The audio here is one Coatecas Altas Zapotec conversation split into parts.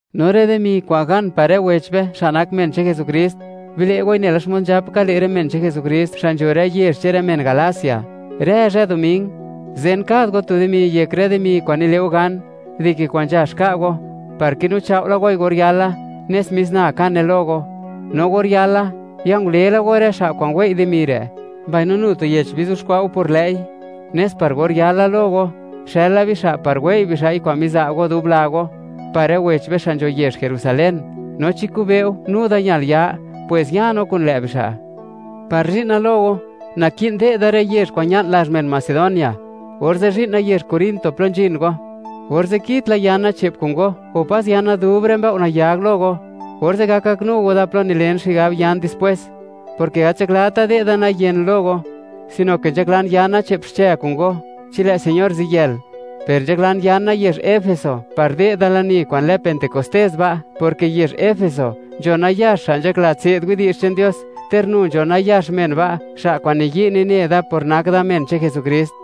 No rë dimi kwa'n gan par rë wech be, xa' nak men che'n Jesukrist; bile' goi nela xmod nzhap ka, le' rë men che'n Jesukrist, xa' nzho rë yezh che'n rë men Galacia. Rë zhë Doming, zen kad go tu dimi yek rë dimi kwa'n nile' go gan, dike kwa'n nzhax ka' go, par kinu chao' la goi or yala, nes mis na kane lo go. No or yala, ya ngule la go rë xa' kwa'n wei' dimi re', mbaino nu tu yech bizuxkwa' go por lë'i, nes par or yala lo go, xëla bixa' par wei' bixa' kwa'n miza' go dub la go, par rë wech be xa' nzho yezh Jerusalén. No chi kube'u, nu da ñal ya, pwes ya no kun lë' bixa'. Par zhi'na lo go, naki'n de'da rë yezh kwa'n ña'n lazh men Macedonia, orze' zhi'na yezh Corinto plo nzhin go. Orze' kitla yana che'p kun go, o pas yana dub rë mbëo' nayag lo go; orze' gak gaknu go da plo nilen xigab yan dispwes, porke gat nzhaklata de'da nayen lo go, sino ke nzhaklan yana che'p xche kun go, chi lë' Señor ziyël. Per nzhaklan yana yezh Efeso, par de'da lani kwa'n lë Pentecostés ba', porke yezh Efeso, nzho nayax xa' nzhakla tse'd widi'zh che'n Dios, ter nu nzho nayax men ba', xa' kwa'n niyi' nine da por nak da men che'n Jesukrist.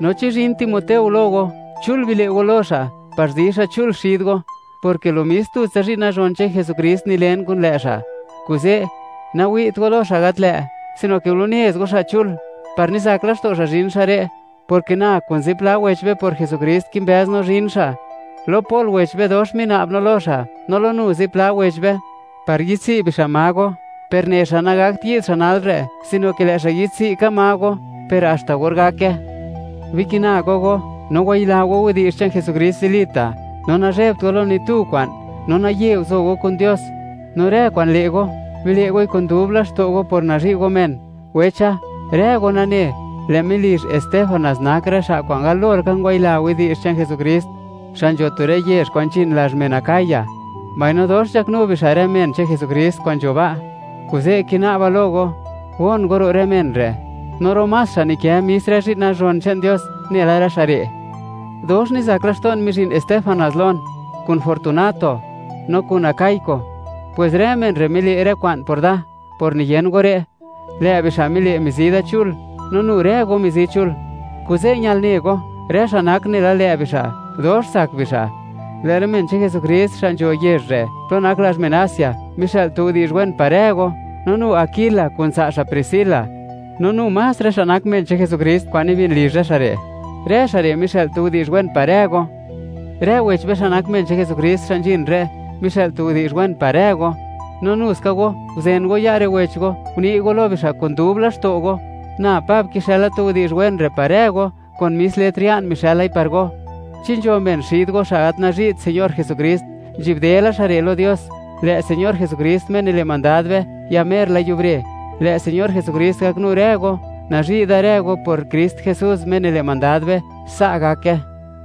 No chi zhin Timoteo lo go, chul bile' go lo xa' par zi xa' chul xid go, porke lo mis tutsa zhi'n nazhon che'n Jesukrist nilen kun lë' xa'. Kuze' nawi't go lo xa' gat lë'; sino ke gulunez go xa' chul, par nizak laxto' xa' zhin xa' re', porke na kun zipla wech be por Jesukrist, kimbëz no zhin xa'. Lo Pol wech be, dox mina'ba lo xa', no lo nu zipla wech be, par yi'dtsi' bixa' ma go, per ne xa', nagakt yi'd xa' nal re', sino ke lë' xa' yi'dtsi' ka ma go, per haxta or gake. Bikina go go, no wayila go widi'zh che'n Jesukrist zilita', no nazhebt go lo ni tu kwa'n, no naye guzo go kun Dios. No rë kwa'n le' go, bile' goi kun dub laxto' go por nazhi' go men. Wecha, rë go nane, lë' melizh Estéfanas nak rë xa' kwa'n galo laka ngwayila widi'zh che'n Jesukrist, xa' nzho tu rë yezh kwa'n nzhin lazh men Acaya, mbaino dox nzhaknu bixa' rë men che'n Jesukrist kwa'n nzho ba', kuze' kina'ba lo go, gon go ro' rë men re', no ro' más xa' nikë mis rë zhi'n nazhon che'n Dios, nela rë xa' re'. Dox nizak laxto'n mizhin Estéfanas lon, kun Fortunato no kun Akaiko; pwes rë men re' mile' rë kwa'n por da, por niyen go re'. Lë' bixa' mile', mizi da chul, no nu rë go mizi chul; kuze' ñal ne go, rë xa' nak nela lë' bixa', dox tsak bixa'. Lë' rë men che'n Jesukrist xa' nzho yezh re', plo nak lazh men Asia, mixë'l tu widi'zh wen par rë go. No nu Aquila kun tsa' xa' Priscila, no nu más rë xa' nak men che'n Jesukrist kwa'n nibin lizh rë xa' re'; rë xa' re' mixë'l tu widi'zh wen par rë go. Rë wech be xa' nak men che'n Jesukrist, xa' nzhin re', mixë'l tu widi'zh wen par rë go; no nu ska go, guzen go ya' rë wech go, uni' go lo bixa' kun dub laxto' go. Na Pab, kixëla tu widi'zh wen re' par rë go; kun mis letr ya'n mixë'lai par go. Chi nzho men xid go, xa' gat nazhi't Señor Jesukrist, nzhi'bde la xa' re' lo Dios. ¡Lë' Señor Jesukrist, Me nile' mandad be, ya mer la yubre! Lë' Señor Jesukrist gaknu rë go. Nazhi' da rë go por Krist Jesús, Me nile' mandad be. Sa' gake.